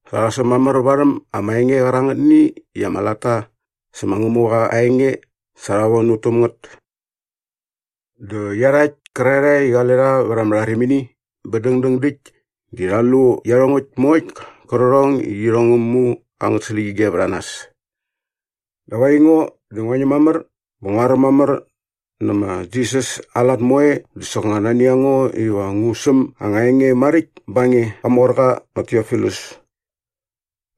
Sa rha säm mamär varhäm ama enge qärangätni i ama latta sä ma Ngämuqa aa enge sa rha von ut täm ngät. Dä iarhakt kärarhae i qale rha vät ama rharimini bä dängdäng däkt di rha lu iarhongäkt moe qärqärhong i irhong ngä mu angät släqyige vät a nas. Dap aingo di ngua ñäm mamär bä ngua räm mamär nä ma Jisas aa lat moe dä soknga nani a ngo iva ngu säm anga enge maräkt ba nge, qamorqa ma Tiofilus.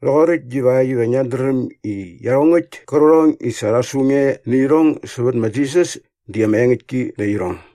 Rhoqoräkt divakt iva ngiat dräm i iarhongäkt kärqärhong i sa rha su nge nä irhong sävät ma Jisas di ama engäktki nä irhong.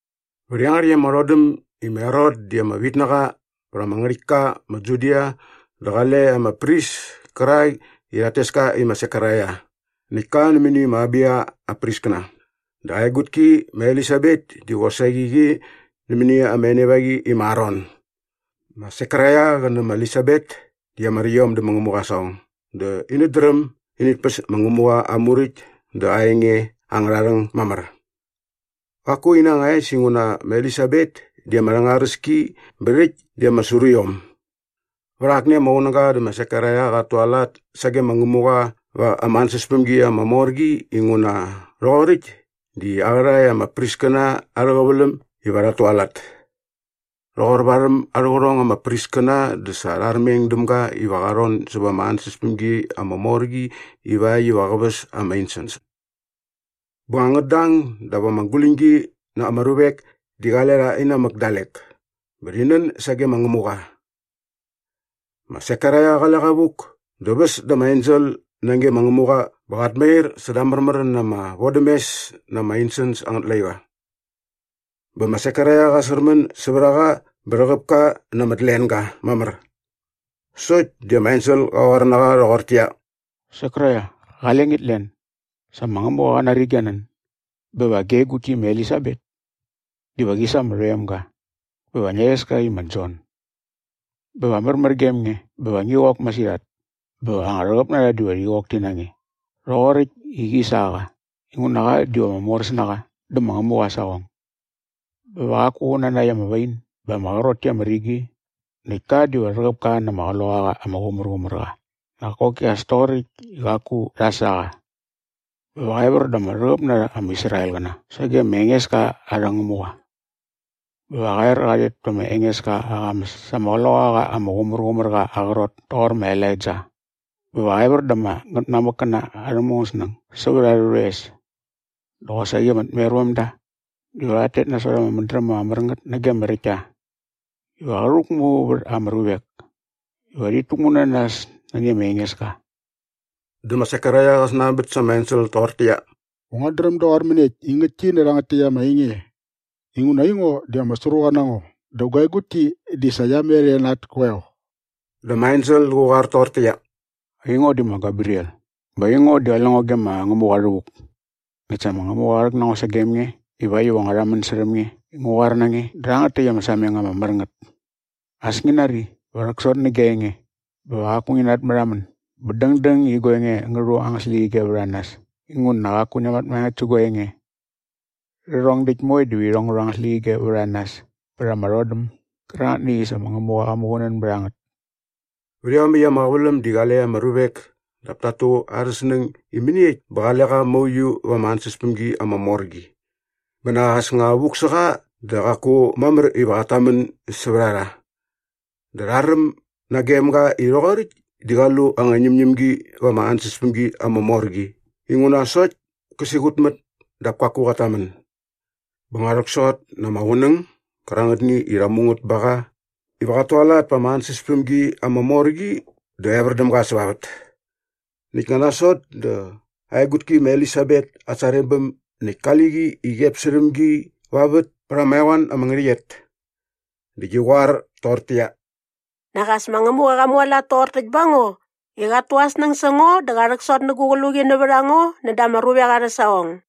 Vät iangärhäkt ama rhodäm i ma Herot di ama vitnaqa e vät ama ngärhäktka ma Judia dä qale ama pris kärak i rhat tes ka i ma Sekaraia. Näkt ka nämäni ma Abiya aa priskäna. Dä aa egutki ma Elisabet di qosaqi qi nämäni ama enevaqi i ma Aron. Ma Sekaraia qä nä ma Elisabet di ama räkt iom dä ma Ngämuqa aa saqong dä inät dräm init päs ma Ngämuqa aa Muräkt dä aa enge angärha rhäng mamär. Qaku ina anga es inguna ma Elisabet di ama rhängaräs ki bä rhäkt di ama sru iom. Vät akni ama qunäga dä ma Sekaraia qat tualat sage ma Ngämuqa va ama ansäspämgi ama mor qi inguna rhoqoräkt di aa qärhae ama priskäna arhä qäväläm iva rhat tualat. Rhoqor varhäm arhä qärhong ama priskäna dä sa rha armeng däm ga iva qa rhon säva ama ansäspämgi ama mor qi ivakt iva qä väs ama insens. Bä nga ngät dang dap ama guläñgi na ama ruvek di qale rha inamäk dalek bä rhi nän sage ma Ngämuqa. Ma Sekaraia qale qa vuk dä väs da ama ensel nage ma Ngämuqa bä qat mair säda aa märmär na ama vodämes na ama insens angät laiqa. Bä ma Sekaraia qa särmän sävät a qa bä rhäqäp ka na ama tlenga mamär. Sokt di ama ensel qa qoar na qa rhoqortäqyia, “Sekaraia, qale ngit len! Sa ma Ngämuqa qa nari gia nän bä va gia egutki ma Elisabet diva qi sa ama rhoemga bä va ngia rhes ka i ma Jon. Bä va märmär gem nge bä va ngi qok masirhat bä anga rhäqäp na rha diva rhi qok ti na nge rhoqoräkt i qi sa qa inguna qa diva ama moräs na qa dä ma Ngämuqa aa saqong. Bä va qaku qä natnakt ama wain bä ama qrot ki ama rigi näkt ka diva rhäqäp ka na ama Qloqaqa ama Qumärqumärqa nak koki as toqoräkt i qaku rha sa qa. “Bä va qa evär da ama rhäqäp na rha ama Israelqäna sage ma Engeska arhä Ngämuqa. Bä va qa er qa rhet pä ma Engeska aa qamäs sa ama Qloqaqa ama Qumärqumärqa aa qrot toqor ma Elaija bä va qä evär da ama ngätmamäkkäna arhä mungäsnäng sävät arhä rhoes dä qosaqi ama tmervämda diva rhat tet nasot ama mädräm ama mär ngät nage ama räktta. Iva qä rhäkmu vät ama ruvek iva rhit täkmu na nas nani ma Engeska.” Dä ma Sekaraia qä snanbät sa ama ensel toqortäqyia, “Va nguat dräm doqor mäniekt i ngäktki nä rhangät täkt ama enge? Inguna aingo di ama sruqa na ngo dä gua egutki di sa qia met e na at koeo.” Dä ama ensel qä qoar toqortäqyia, “Aingo di ma Gebriel. Bä aingo di qale ngo ge ma Ngämuqa rhävuk. Näkt sa ma Ngämuqa qa rhäk na ngo sagem nge ivakt iva ngua rhamän särhäm nge i ngu qoar na nge nä rhangät täkt ama sameng ama mär ngät. As ngi nari, va rhäksot nä gia enge bä va qaku ngi natmärhamän bä dängdäng i gua enge ngä rhu angät släqyige vät a nas inguna qaku ngia mat maengäkt sä gua enge. Rhärhong däkt moe diva irhong ngä rhu angät släqyige vät a nas pät ama rhodäm gärangätni i sa ma Ngämuqa qa muqunän bät a ngät.” Vät iomäkt ama qäväläm di qale ama ruvek dap tat tu arhä snäng i mäniekt bä qale qa mauiu va ama ansäspämgi ama mor qi. Bä nak as nga vuk sä qa dä sa qaku mamär iva qat tamän sävät a rha. Dä rha räm nagem ga i rhoqoräkt di qa lu anga ñämñämgi va ama ansäspämgi ama mor qi inguna sokt kä siqutmät dap kaku qat tamän. Bä nga rhäksot na ama qunäng gärangätni i rha mu ngät bä ba qa iva qat tualat pa ama ansäspämgi ama mor qi dä evär däm ga säva vät. Näkt nga nasot dä aa egutki ma Elisabet at sarebäm näkt kali qi i qep särhäm gi va vät pät ama eqoan ama ngärhäqyet. Dä qi qoar toqortäqyia, “Nak as ma Ngämuqa qa mualat toqor täkt ba ngo i qat tu aa snäng sä ngo dä qa rhäksot nä gu qluqi nävät a ngo näda ama ruvek arhä saqong.”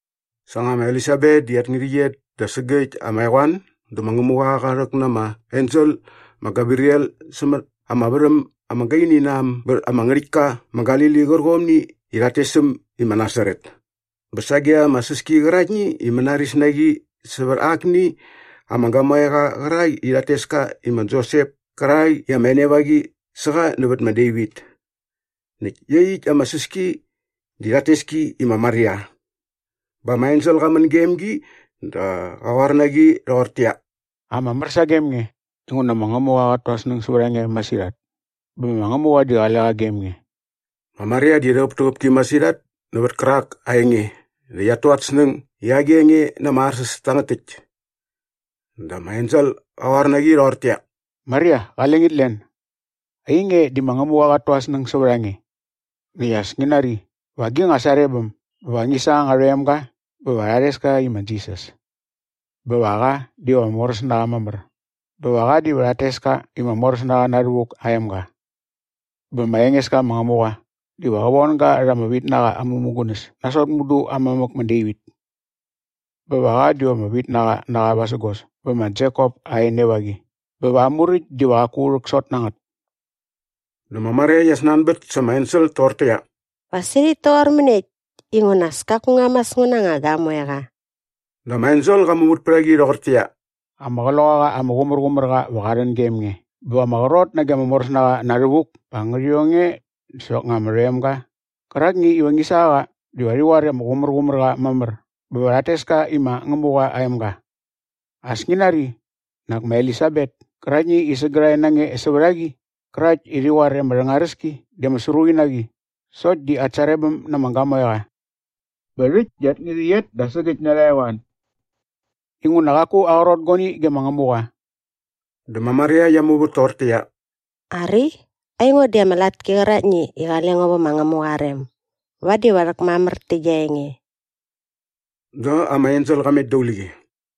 Sa nga ma Elisabet di at ngärhäqyet da sägäkt ama eqoan dä ma Ngämuqa qa rhäk na ama ensel ma Gebriel sämät ama värhäm ama gaini na äm bät ama ngärhäktka ma Galili qärqomni i rhat tes äm i ma Nasaret bä sage ama säski qäraktni i mänaris na qi sävät akni ama gamoeqa qärak i rhat tes ka i ma Josep kärak i ama enevaqi sä qa nävät ma Devit. Näkt iaqyäkt ama säski di rhat tes ki i ma Maria. Bä ama ensel qa män gem gi dä qä qoar na qi rhoqortäqyia, “Ama mär sagem nge inguna ma Ngämuqa qat tu aa snäng sävät a nge masirhat. Bä ma Ngämuqa di qale qa gem nge.” Ma Maria di rhäqäptäqäp ki masirhat nävät kärak aa enge dä qiat tu at snäng i agi enge na ama arsäs tangät täkt. Dä ama ensel qä qoar na qi rhoqortäqyia, “Maria, qale ngit len. Ainge di ma Ngämuqa qat tu aa snäng sävät a nge. Näkt as ngi nari, va gi nga sarebäm bä va ngi sa anga rhoemga bä va ngia rhes ka i ma Jisas. Bä va qa diva ama moräs na qa mamär bä va qa diva rhat tes ka i ma Moräsnaqa Na Rhävuk aa emga. Bä ma Engeska ma Ngämuqa diva qä von ga rha ama vitnaqa aa mämugunäs nasot mudu aa mamäk ma Devit. Bä va qa diva ama vitnaqa na qa vasägos bä ma Jekop aa enevaqi bä va aa muräkt diva qaku rhäksot na ngät.” Dä ma Maria qia snanbät sa ama ensel toqortäqyia, “Va sirhäkt toqor mäniekt inguna as kaku ngua mas ngu na anga gamoeqa?” Dä ama ensel qa muvät pät a qi rhoqortäqyia, “Ama Qloqaqa ama Qumärqumärqa va qä rhän gem nge bä va ama qrot nage ma Moräsnaqa Na Rhävuk pa ngärhi ong nge dä soknga ama rhoemga qärakni iva ngi sa qa diva rhi qoar i ama qumärqumär qa mamär bä va rhat tes ka i ma Ngämuqa aa emga. As ngi nari, nak ma Elisabet käraktni i sägärhae na nge sävät a qi qärakt i rhi qoar i ama rhängaräs ki dä ama sruqi na qi sokt di at sarebäm na ama gamoeqa bä rhäkt di at ngärhäqyet da sägäkt na arha eqoan. Inguna qaku aqrot guani ge ma Ngämuqa.” Dä ma Maria qia muvät toqortäqyia, “Ari, aingo di ama latki qäraktni i qale ngo vä ma Ngämuqa aa rem. Vadi va rhäkmamär tä gia enge.” Dä ama ensel qa met daqule qi.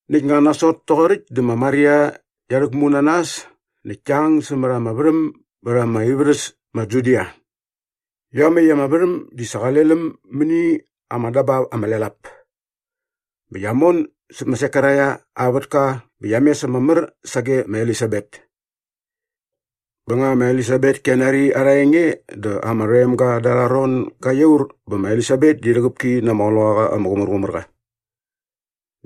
Näkt nga nasot toqoräkt dä ma Maria qia rhäkmu na nas näkt kia ang sämät ama värhäm bät ama ivärhäs ma Judia. Iomäkt ama värhäm di sa qale läm mäni ama dabap ama lel ap. Bä qia mon säp ma Sekaraia aa vätka bä qia mes ama mär sage ma Elisabet. Bä nga ma Elisabet kia nari arha enge dä ama rhoemga da arha ron ga iaur bä ma Elisabet di rhäqäp ki na ama Qloqaqa ama Qumärqumärqa.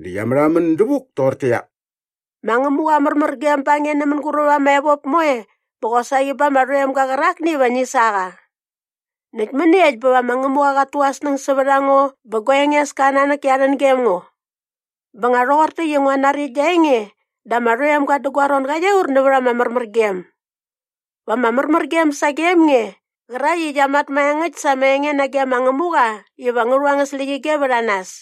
Dä qia märhamän dävuk toqortäqyia, “Ma Ngämuqa aa märmärgem ba nge nä mänguräp ama evop moe bä qosaqi ba ama rhoemga qärakni iva ngi sa qa. Näkt mäniekt bä va ma Ngämuqa qat tu aa snäng sävät a ngo bä gua Engeska aa nanäk kia rhän gem ngo. Bä nga rhoqor täkt i ngua nari gia enge dä ama rhoemga dä gua ron ga iaur nävät ama märmärgem. Va ama märmärgem sagem nge, qärakt i qia mat maengäkt sa ama enge nage ma Ngämuqa iva ngä rhu angät släqyige vät a nas.”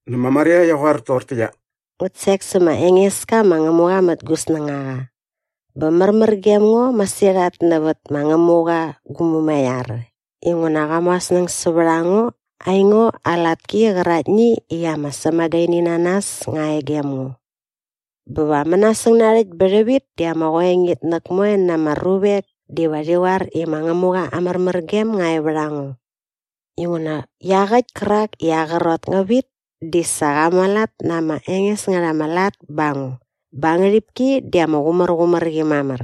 Dä ma Maria qia qoar toqortäqyia, “Ngut sek sä ma Engeska ma Ngämuqa mät gu snängaqa bä märmär gem ngo masirhat nävät ma Ngämuqa gu Mumaiar inguna qa mu aa snäng sävät a ngo aingo aa latki qäraktni i ama sämagaininanas nga e gem ngo. Bä va mänasäng narhäkt bä rhävit di ama qoengitnäk moe na ama ruvek diva rhi qoar i ma Ngämuqa aa märmärgem nga e vät a ngo. Inguna iaqäkt kärak i aa qrot ngä vit di sa qa mualat na ama enges ngät ama lat ba ngo bä aa ngärhipki di ama qumärqumär qi mamär.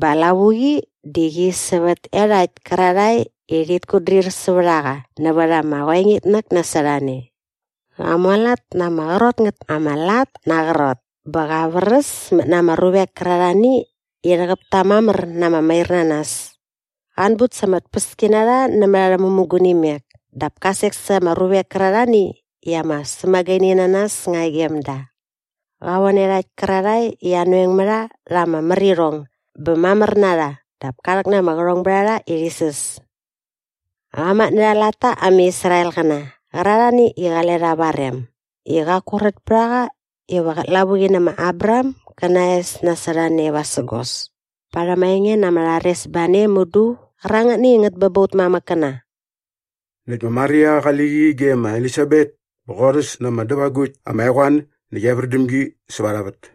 Bä aa lavuqi di qi sävät iarhakt kärarhae i rhit kutdrir sävät a qa nävät ama qoengitnäk nasot a ne. Qa mualat na ama qrot ngät ama lat na aa qrot bä qa vräsmät na ama ruvek kärarhani i rhäqäp ta mamär na ama mairnanas. Qa anbut sa ama tpäskinarha nämät arhä mämugunimek dap ka sek sa ama ruvek kärarhani i ama sämagaininanas nga e gem da. Qa von iarhakt kärarhae i anoeng mä rha rha ama märirhong bä mamär na rha dap ka rhäk na ama qärhongbärharha i rhi säs. Qa matnärha aa latta ama Israelqäna qärarhani i qale rha va aa rem i qaku rät pät a qa iva qät lavuqi nä ma Abraham gä na aa es nasot a ne vasägos parhäm aa enge na ama rharesbane mudu qärangätni i ngät bä ba ut mamäkkäna.” Näkt ma Maria qali qi ge ma Elisabet bä qorhäs na ama dävagukt ama eqoan näkt evär däm gi säva arha vät.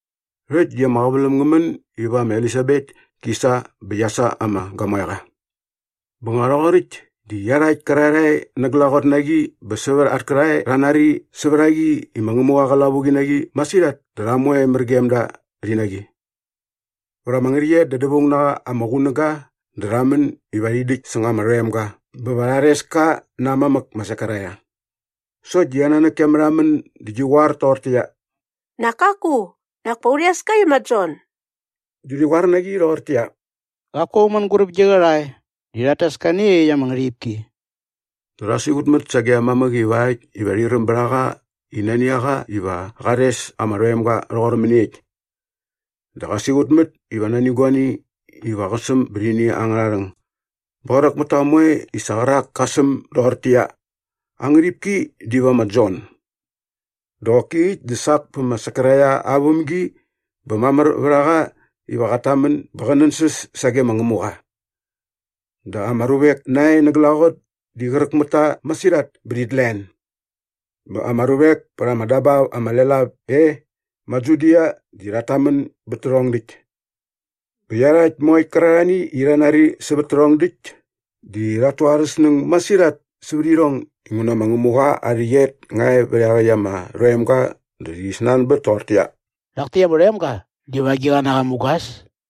Rhäkt di ama qäväläm ngä män iva ma Elisabet ki sa bä qia sa ama gamoeqa. Bä rhoqoräkt di iarhakt kärarhae na glaqot na qi bä sävät at kärhae rha nari sävät a qi i ma Ngämuqa qa lavuqi na qi masirhat dä rha moe mär gem da rhi na qi. Vät ama ngärhäqyet da dävaung na qa ama qunäga dä rha män iva rhi däkt säng ama rhoemga bä va rha rhes ka na aa mamäk ma Sekaraia. Sokt di aa nanäk kia märhamän dä qi qoar toqortäqyia, “Nak kaku, nak pa u rhes ka i ma Jon.” Dä rhi qoar na qi rhoqortäqyia, “Qaku aung mänguräp gi qärhae di rhat tes ka nä iaqyäkt ama ngärhipki.” Dä rha siqutmät sage aa mamäk ivakt iva rhi räm bät a qa i nani a qa iva qa rhes ama rhoemga rhoqor mäniekt. Dä qa siqutmät iva nani guani iva qä säm bät ini angärha rhäng. Bä qräk mät ta moe i sa qärak ka säm doqortäqyia, “Aa ngärhipki diva ma Jon.” Dä qoki äkt dä sak pä ma Sekaraia aa vämgi bä mamär vät a qa iva qat tamän bä qä nänsäs sage ma Ngämuqa. Dä ama ruvek nae na glaqot di qräk mät ta masirhat bä rhit len. Bä ama ruvek pät ama dabap ama lel ap e ma Judia di rhat tamän bät tärhong däkt. Bä iarhakt moe qärarhani i rha nari sävät tärhong däkt di rhat tu arhä snäng masirhat sävät irhong inguna ma Ngämuqa aa rhäqyet nga e vät iaqäkt ama rhoemga dä rhi snanbät toqortäqyia, “Rhak täkt ama rhoemga diva agiqa na qa mugas?”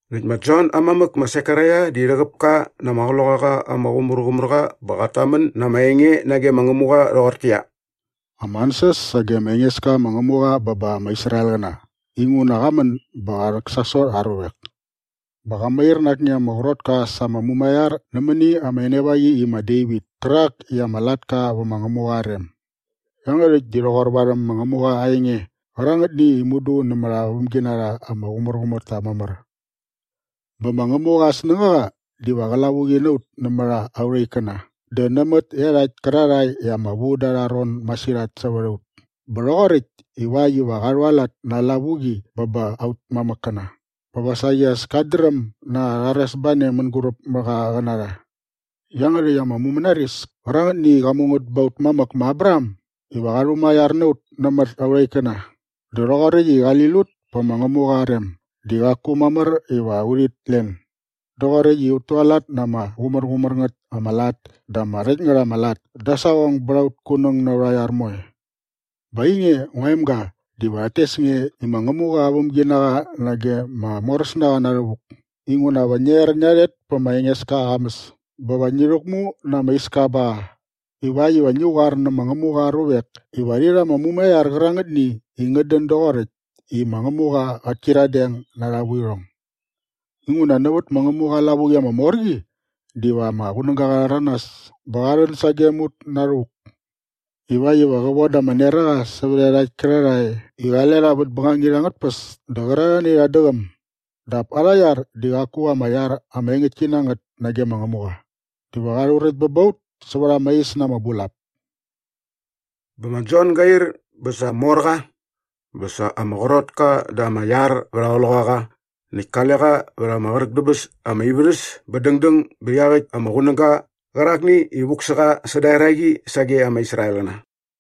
Näkt ma Jon aa mamäk ma Sekaraia di rhäqäp ka na ama Qloqaqa ama Qumärqumärqa bä qat tamän na ama enge nage ma Ngämuqa rhoqortäqyia, “Ama ansäs sage ma Engeska ma Ngämuqa bä ba ama Israelqäna inguna qa män bä qa rhäksasot aa ruvek. Bä qa mair na akni ama qrotka sa ama mumaiar nämäni ama enevaqi i ma Devit kärak i ama latka vä ma Ngämuqa aa rem. Iangärhäkt di rhoqor varhäm ma Ngämuqa aa enge qärangätni i mudu nämät aa vämginarha ama qumärqumär ta mamär. Bä ma Ngämuqa aa snängaqa diva qä lavuqi na ut nämät aurha ikkäna dä nämät iarhakt kärarhae i ama vu da arha ron masirhat sävät a ut bä rhoqoräkt ivakt iva qa rhualat na aa lavuqi bä ba aut mamäkkäna bä va saqi as kat dräm na aa rharesbane mänguräp mä qa qä na rha. Iangärhäkt ama mumänaris kärangätni i qa mu ngät ba aut mamäk ma Abraham iva qa rhumaiar na ut nämät aurha ikkäna dä rhoqoräkt i qali lut pä ma Ngämuqa aa rem di qaku mamär iva urhit len doqoräkt i ut tualat na ama qumärqumär ngät ama lat dä ama räkt ngät ama lat da aa saqong bät aut kunäng na aurha iar moe. “Bä ainge ngua emga diva rhat tes nge i ma Ngämuqa aa vämginaqa nage ma Moräsnaqa Na Rhävuk inguna va ngia er ngia rhet pä ma Engeska aa qamäs bä va ngi rhäkmu na ama iska ba qa ivakt iva ngi qoar nä ma Ngämuqa aa ruvek iva rhi rha ama mumaiar qärangätni i ngät dän doqoräkt i ma Ngämuqa qät kyiradeng na arha vuirhong. Inguna nävät ma Ngämuqa aa lavuqi ama mor qi diva ama qunäga qa rhäranas bä qa rhän sagem ut na rhävuk ivakt iva qä voda ama neraqa sävät iarhakt kärarhae i qale rha vät bängangit angät tpäs dä qärarhani i rhat däqäm dap arha iar di qaku ama iar ama engäktki na ngät nage ma Ngämuqa dä va qa rhuräkt bä ba ut säva ama is na ama bulap.” Bä ma Jon ga ir bä sa mor qa bä sa ama qrot ka da ama iar vät aa qloqaqa näkt kale qa vät ama qräk dä bäs ama ivärhäs bä dängdäng bät iaqäkt ama qunäga qärakni i vuk sä qa säda eraqi sage ama Israelqäna.